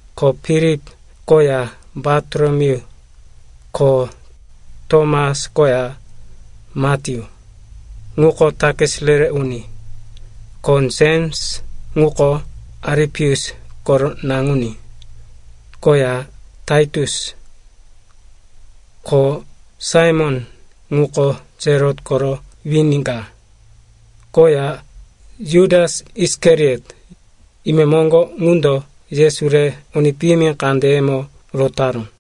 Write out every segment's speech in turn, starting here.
Ko Filip koya Bartolomeyu, ko Tomas koya Matyu, ŋuko takis re-re uni. Ko Jems, ŋuko Alipeus koro naŋuní, koya Tatius. Ko Saimon, ŋuko Selot koro wini ka, koya Jutas Isikariot, imemoŋgo ŋundo Yesu re uni piyimi kandeyemo rotaró.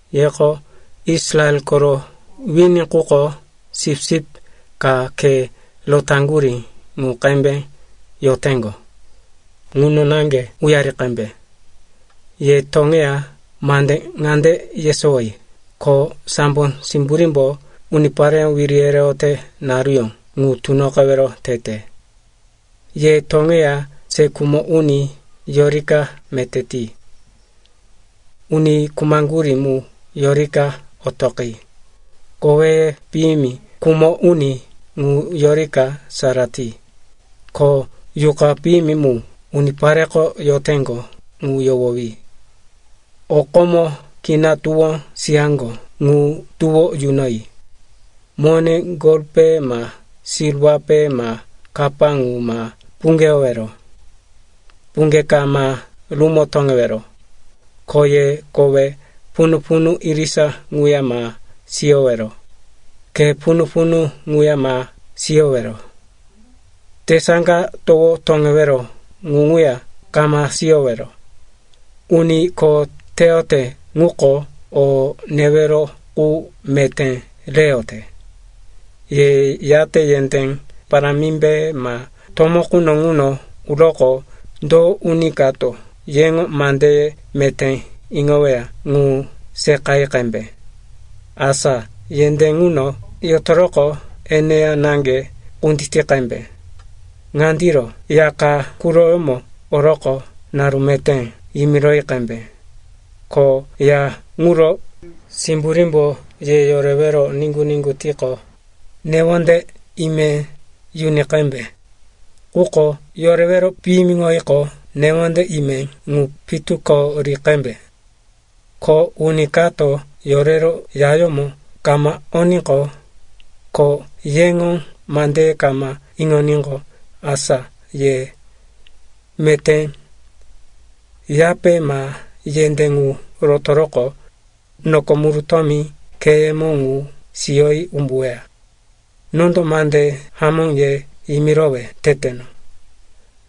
Yeko Israel koro wini quko, sipsip ka khe rotaŋgurí qu qembe yoteŋgo, ŋuno naŋge uyari qembe. Ye toŋeya mande ŋande yesowoyi, ko sambo simburímbo unipareyó wiri yereyote naruyó ŋu tunoqewero tete. Ye toŋeya se khumo uni yorika meté ti, uni khumaŋgurí mu yorika otoqi, koweye piyimi khumo uni ŋu yorika sara ti, ko yuqa piyimi mu unipareko yoteŋgo ŋu yohowi. O komo kina tuwó siyaŋgo ŋu tuwó yunoyi. Mone golpe ma silwape ma kapa ŋu ma puŋgeyowero. Puŋge ka ma rumo toŋewero. Ko ye kowe punu-punu irisa ŋuya ma siyowero, khe punu-punu ŋuya ma siyowero, tesaŋga towo toŋewero qu ŋuya kama siyowero. Uni kho teyote ŋuko, o newero qu meté reyote. “Ye yate yendé parámimbe ma tomó quno ŋuno uroqo, do uni kato yeŋo mandeye meté iŋoweya ŋu seqayi qembe. Asa yendé ŋuno yotoroqo, eneya naŋge kunditi qembe. Ŋandiro, ya ka quroyómo oroqo, “Naru meté,” yimiroyi qembe. Ko ya ŋuro simburímbo ye yorewero niŋgu-niŋgu tiqo, newonde ime yuni qembe, quko yorewero piyimiŋoyiqo, newonde ime ŋu pitu ko ri qembe. Ko uni kato yorero yayómo kama oníqo, ko yeŋo mandeye kama iŋoníqo, asa ye meté yape ma yendé ŋu rotoroqo, noko murutómi kheyemo ŋu siyoyi umbuweya. Nondo mande hamó ye yimirowe teteno,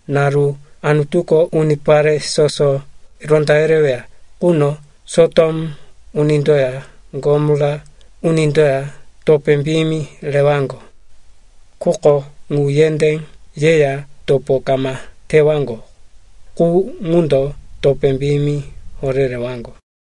naru Anutuko unipare soso ronda yereweya quno Sotom unindoya Gomora unindoya topé piyimi rewaŋgo. Quko ŋu yendé yeya topo kama tewaŋgo qu ŋundo topé piyimi horé rewaŋgo.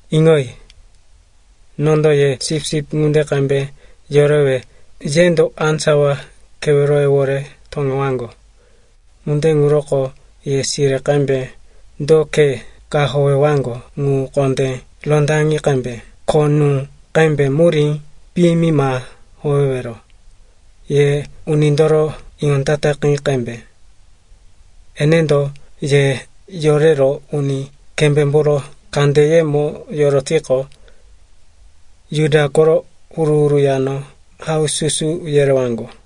“Iŋoyi. Nondo ye sipsip ŋunde qembe yorewe yendo á sawa keweroyewore toŋewaŋgo. Ŋunde ŋuroko ye sire qembe do khe ka howewaŋgo ŋu kondé rondaŋi qembe, ko nú qembe murí piyimi ma howewero. Ye unindoro iŋondataqi qembe. Enendo ye yorero uni kembémboro kandeyemo yorotiqo, Juda koro huru-huru yano haususu yerewaŋgo.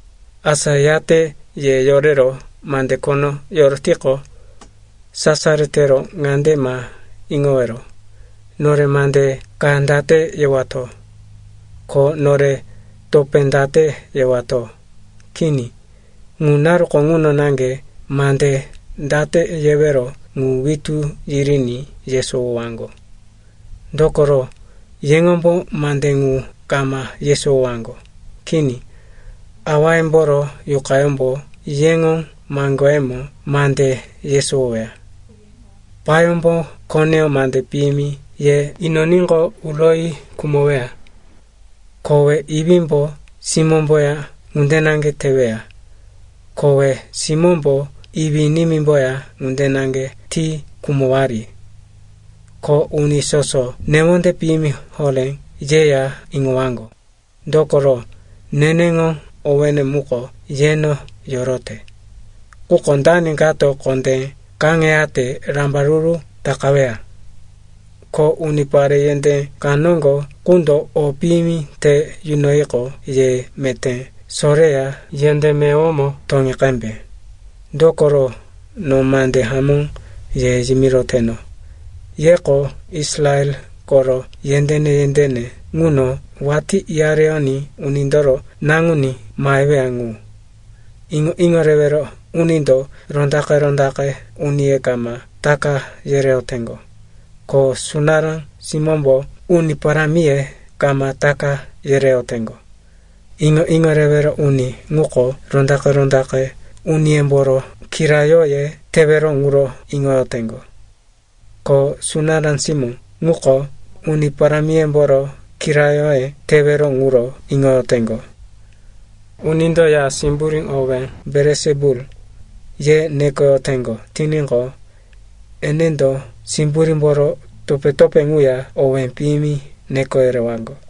Asa yate ye yorero mande khono yorotiqo, sasaro tero ŋande ma iŋowero, ‘Nore mande ka date yewato? Ko nore topé date yewato?’ Kini. Ŋu naruko ŋuno naŋge mande date yewero ŋu witú yiriní yesowowaŋgo. Dokoro, yeŋombo mande ŋu kama yesowowaŋgo. Kini, Awayemboro Yuqayómbo yeŋo maŋgoyembo mande yesowoweya. “Payómbo koneyó mande piyimi ye inoníqo, uroyi khumoweya. Kowe iwímbo simómboya ŋunde naŋge teweya. Kowe simómbo iwí-nimímboya ŋunde naŋge ti khumowari. Ko uni soso newonde piyimi horé yeya iŋowaŋgo, dokoro neneŋo owéne muko yeno yorote. Quko dani kato kondé kaŋeyate rambaruru takaweya. Ko unipare yendé ka noŋgo qundo o piyimi te yunoyiqo, ye meté soreya yendé meyowomo toŋi qembe. Dokoro no mande hamó ye yimiroteno, yeko Israel koro yendéne-yendéne ŋuno watí uyareyoní Unindoro Naŋuní maheweya ŋu.” “Iŋo-iŋo rewero unindo rondaqe-rondaqe uniye kama taka yereyoteŋgo, ko sunará simómbo uni parámiye kama taka yereyoteŋgo. Iŋo-iŋo rewero uni ŋuko rondaqe-rondaqe uniyemboro kiraróye tewero ŋuro iŋoyoteŋgo. Ko sunará simó ŋuko uni parámiyemboro kiraróye tewero ŋuro iŋoyoteŋgo. Unindo ya simburí owé, Belisipulu, ye nekoyoteŋgo tiníqo, enendo simburímboro topé-topé ŋuya owé piyimi neko yerewaŋgo.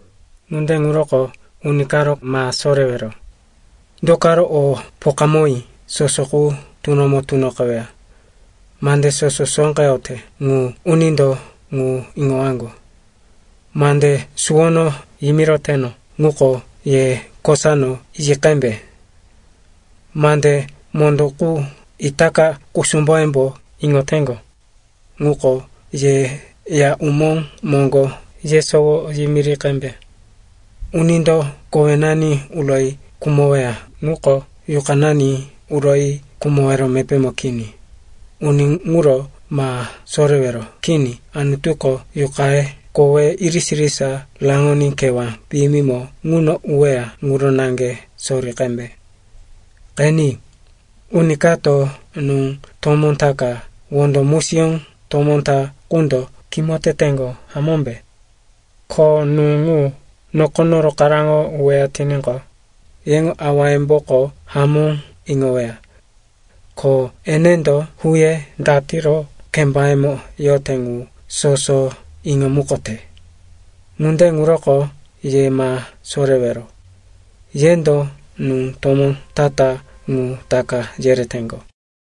“Ŋunde ŋuroko uni karo ma sorewero. Dokoro o pokawí soso ŋu tunomo tunoqeweya. Mande soso sóqeyote ŋu unindo ŋu iŋowaŋgo. Mande suwono yimiroteno ŋuko ye kosano yi qembe. Mande mondó qu itaka kusumboyembo iŋoteŋgo, ŋuko ye ya umó moŋgo yesowo yimiri qembe. Unindo kowenani uroyi khumoweya ŋuko yuqanani uroyi khumowero mepémo kini. Uni ŋuro ma sorewero. Kini, Anutuko yuqaye, koweye irisa-irisa raŋoní kewá piyimimo ŋuno uweya ŋuro naŋge sori qembe. Qeni, uni kato nú tomó ta ka wondo musiyó tomó ta qundo kimo teteŋgo, hamómbe? Ko nú ŋu nokono rokaráŋo uweya tiníqo, yeŋo awayemboko hamó iŋoweya. Ko enendo huye datiro kembayemo yote ŋu soso iŋomukote. Ŋunde ŋuroko ye ma sorewero. Yendo nú tomó ta-ta ŋu taka yereteŋgo.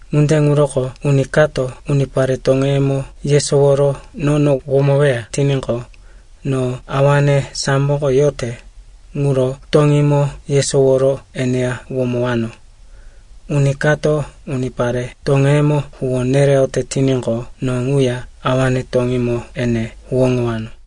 “Ŋunde ŋuroko uni kato unipare toŋeyemo yesoworo nono womoweya tiníqo, no awane samboko yote ŋuro toŋímo yesoworo eneya womowano. Uni kato unipare toŋeyemo huwó nereyote tiníqo, no ŋuya awane toŋímo ene huwóŋowano.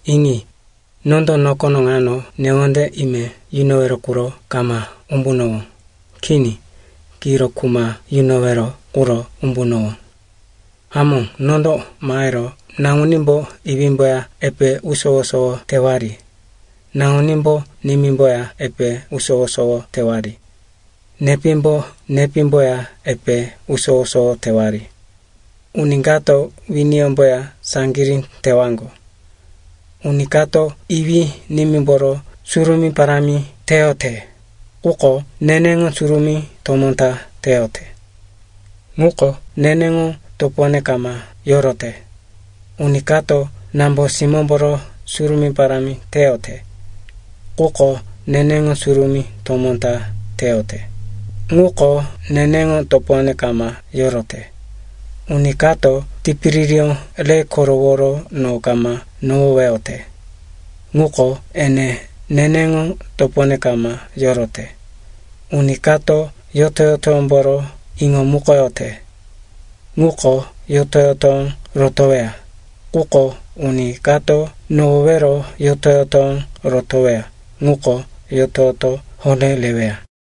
“Iŋi, nondo nokono ŋano newonde ime yunowero quro kama umbunowó. Kini. Kiro kuma yunowero quro umbunowó. Hamó, nondo mahero “‘naŋunímbo iwímboya epe usowo-sowo tewari, nambunímbo nimímboya epe usowo-sowo tewari, nepímbo nepímboya epe usowo-sowo tewari, uni kato winiyómboya saŋgirí tewaŋgo.’ “Uni kato iwí-nimímboro surumí parámi teyote, quko neneŋo surumí tomó ta teyote, ŋuko neneŋo topone kama yorote. Uni kato nambo-simómboro surumí parámi teyote, quko neneŋo surumí tomó ta teyote, ŋuko neneŋo topone kama yorote. Uni kato tipiririyó re koroworo no kama nohoweyote ŋuko, ene neneŋo topone kama yorote. Uni kato yoto-yotoyómboro iŋomukoyote ŋuko yoto-yotoyó rotoweya. Quko uni kato nohowero yoto-yotoyó rotoweya ŋuko yoto-yoto horé reweya.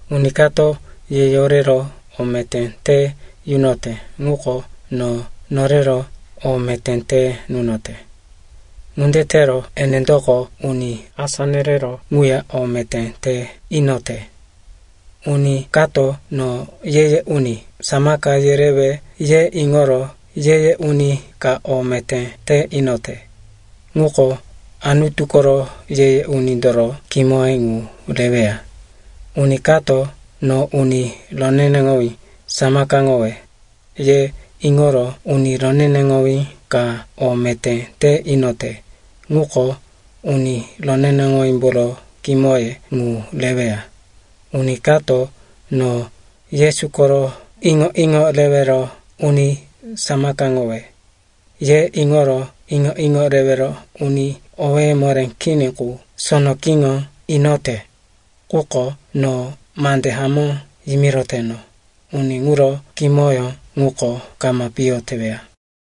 “Uni kato ye yorero o meté te yunote ŋuko no norero o meté te nunote. Ŋunde tero enendoko uni asá nereró ŋuya o meté te inote. Uni kato, ‘No ye-ye uni samaka yerewe,’ ye iŋoro ye-ye uni ka o meté te inote, ŋuko Anutu koro ye-ye unindoro kimoye ŋu reweya. Uni kato, ‘No uni roneneŋowí samakaŋowe,’ ye iŋoro uni roneneŋowí ka o meté te inote, ŋuko uni roneneŋowímboro kimoye ŋu reweya. Uni kato, ‘No Yesu koro iŋo-iŋo rewero uni samakaŋowe,’ ye iŋoro iŋo-iŋo rewero uni owé moré kini qu sono kiŋo inote quko, no mande hamó yimiroteno, uni ŋuro kimoyó ŋuko kama piyo teweya.”